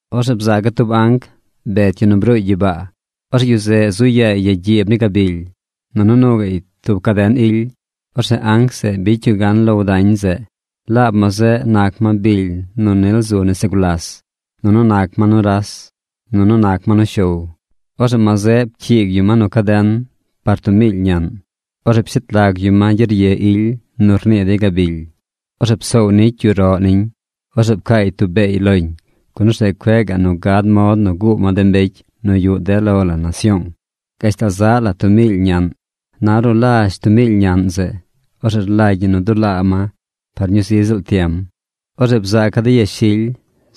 Orzeꞌ bzaaca̱ tub anc bet yu nu bruuy gyibaa. Orzeꞌ yu zeꞌ zu yaay ya gyiib ni gabily. Nunu nuu gaꞌy tub caden ily. Orzeꞌ anc zeꞌ bicy yu gan low dañ zeꞌ. Laab ma zeꞌ nac ma bily nu nil zu nese gulas. Nunu nac ma nuras. Nunu nac ma nushow. Orzeꞌ ma zeꞌ pcyiig yu ma nu caden par tub miily ñaꞌn. Orzeꞌ pshet lag yu ma gyerye ily nu rnii dey gabily. Orzeꞌ psoow nicy yu roꞌ niñ. Orzeꞌ pcaay tub beey loñ. Gun orzeꞌ cueꞌ gaꞌ nu gad mod nu guu ma de mbecy nu yuꞌ de lo la nasyoong gashtal zaꞌ la tub miily ñaꞌn. Na ornu lazh tub miily ñaꞌn zeꞌ, orzeꞌ rlagy ñi nu dulaa ma par ñuu zi ziꞌl tiem. Orzeꞌ bzaaca̱ de yashily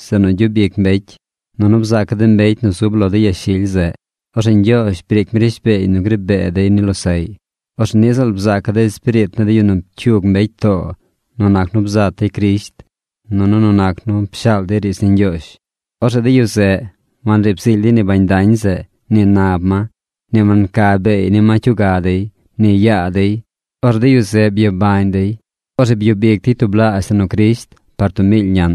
zeꞌ nu gyub ic mbecy. Nunu bzaaca̱ de mbecy nu zub lo de yashily zeꞌ. Orzeꞌ Ñgyoozh briic mi rishbeey nu gri bee dey ni losaꞌy. Orzeꞌ niꞌ ziꞌl bzaaca̱ de espiriit ni de yu nu pcyug mbecy too nu nac nu bzat dey Crisht nunu nu nac nu pshaal dey riidz ni Ñgyoozh. Orzeꞌ de yu zeꞌ wanriib zily dey ni bañ dañ zeꞌ ni nab ma. Ni wanca beey ni ma cyuga dey, ni yaa dey. Orzeꞌ de yu zeꞌ byabañ dey. Orzeꞌ byub ic dey tublaazh la nu Crisht par tub miily ñaꞌn.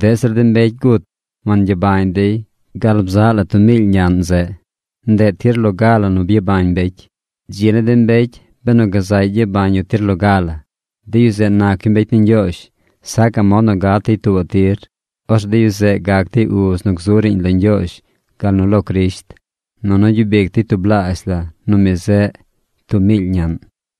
Deꞌ zir de mbecy gut wangyabañ dey gal bzaꞌ la tub miily ñaꞌn zeꞌ. Ndeꞌ tir loga la nu gyabañ mbecy. ¡Dzi ni de mbecy benu gazaꞌy gyabañ yu tir loga la! ¡De yu zeꞌ nac yu mbecy ni Ñgyoozh! Sacaꞌ mod nu gat dey tuubaꞌ tir. Orzeꞌ de yu zeꞌ gac dey uz nu gzu riiñ lo Ñgyoozh gal nu lo Crisht. Nunu gyub ic dey tublaazh nu mi zeꞌ tub miily ñaꞌn.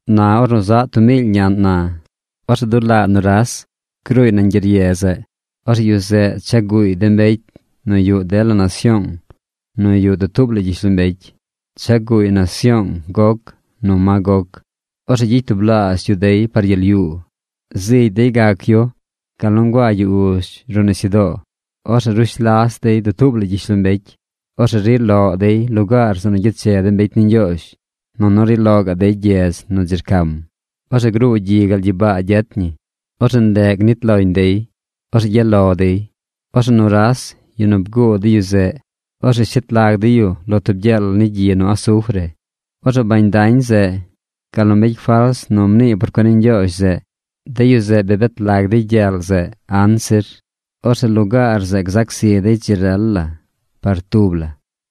Na ornu zaꞌ tub miily ñaꞌn na, orzeꞌ dulaa nuras gruuy nañ gyerye zeꞌ. Orzeꞌ yu zeꞌ cha guuy de mbecy nu yuꞌ dela nasyoong nu yuꞌ dutuub la gyishlombecy. Cha guuy nasyoong Gog nu Magog. Orzeꞌ gyicy tublaazh yu dey par gyel yuu. Zigy dey gac yu gal nu nguaa yu uzh ruꞌ nisyudoo. Orzeꞌ rush las dey dutuub la gyishlombecy. Orzeꞌ ri loꞌ dey lugaar zeꞌ nu gyeche de mbecy ni Ñgyoozh. Nunu ri loꞌ gaꞌ dey gyedz nu dzi rcam. Orzeꞌ gruu gyi gal gyibaa gyet ñi. Orzeꞌ ndeꞌ nit loñ dey. Orzeꞌ gyaꞌ lo dey. Orzeꞌ nuras, yu nu bguu de yu zeꞌ, orzeꞌ shet lag dey yu lo tub gyel ni gyi nu asufre. Orzeꞌ bañ dañ zeꞌ gal nu mbecy fals nu rnii por cuen ni Ñgyoozh zeꞌ, de yu zeꞌ bi bet lag dey gyel zeꞌ anzir. Orzeꞌ lugaar zeꞌ gzac zi dey dzi rel la par tub la.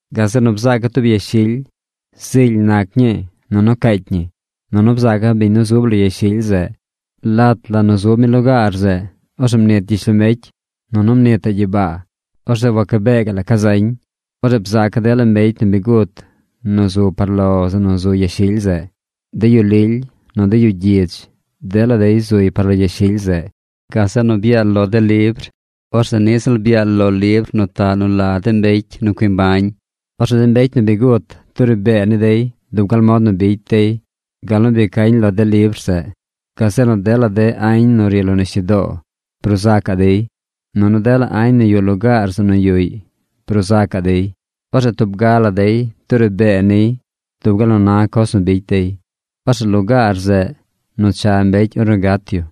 Gazeꞌ nu bzaaca̱ tub yashily. Zily nac ñii. Nunu caacy ñi. Nunu bzaaca̱ biñ nu zub lo yashily zeꞌ. Lat nu zub mi lugaar zeꞌ orzeꞌ mnit gyishlombecy, nunu mnitaꞌ gyibaa. Orzeꞌ wacabee la ca zañ. Orzeꞌ bzaaca̱ dela mbecy nu bi gut nu zu par lo zeꞌ nu zu yashily zeꞌ. De yu lily, nu de yu gyidz, dela dey zuy par lo yashily zeꞌ. Gazeꞌ nu byaal lo de libr. Orzeꞌ niꞌ ziꞌl byaal lo libr nu taꞌ nu la de mbecy nu cui mbañ. Orzeꞌ de mbecy nu bi gut duri bee ni dey dub gal mod nu bicy dey gal nu bi cañ lo de libr zeꞌ. Gazeꞌ nu dela añ nu ri lo nisyudoo bruu zacaꞌ dey, nunu dela añ nu yuꞌ lugaar zeꞌ nu yuꞌy bruu zacaꞌ dey. Orzeꞌ tub ga la dey duri bee niy dub gal nu na coz nu bicy dey. Orzeꞌ lugaar zeꞌ nu cha mbecy ornu gat yu,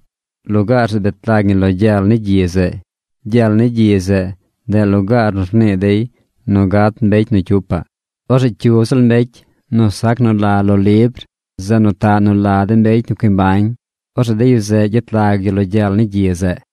lugaar zeꞌ bet lag ñi lo gyel ni gyi zeꞌ. Gyel ni gyi zeꞌ, ndeꞌ lugaar nu rnii dey nu gat mbecy nu cyupaꞌ. Orzeꞌ cyu ziꞌl mbecy nu sac nu la lo libr nu taꞌ nu la de mbecy nu cui mbañ, orzeꞌ de yu zeꞌ gyet lag yu lo gyel ni gyi zeꞌ.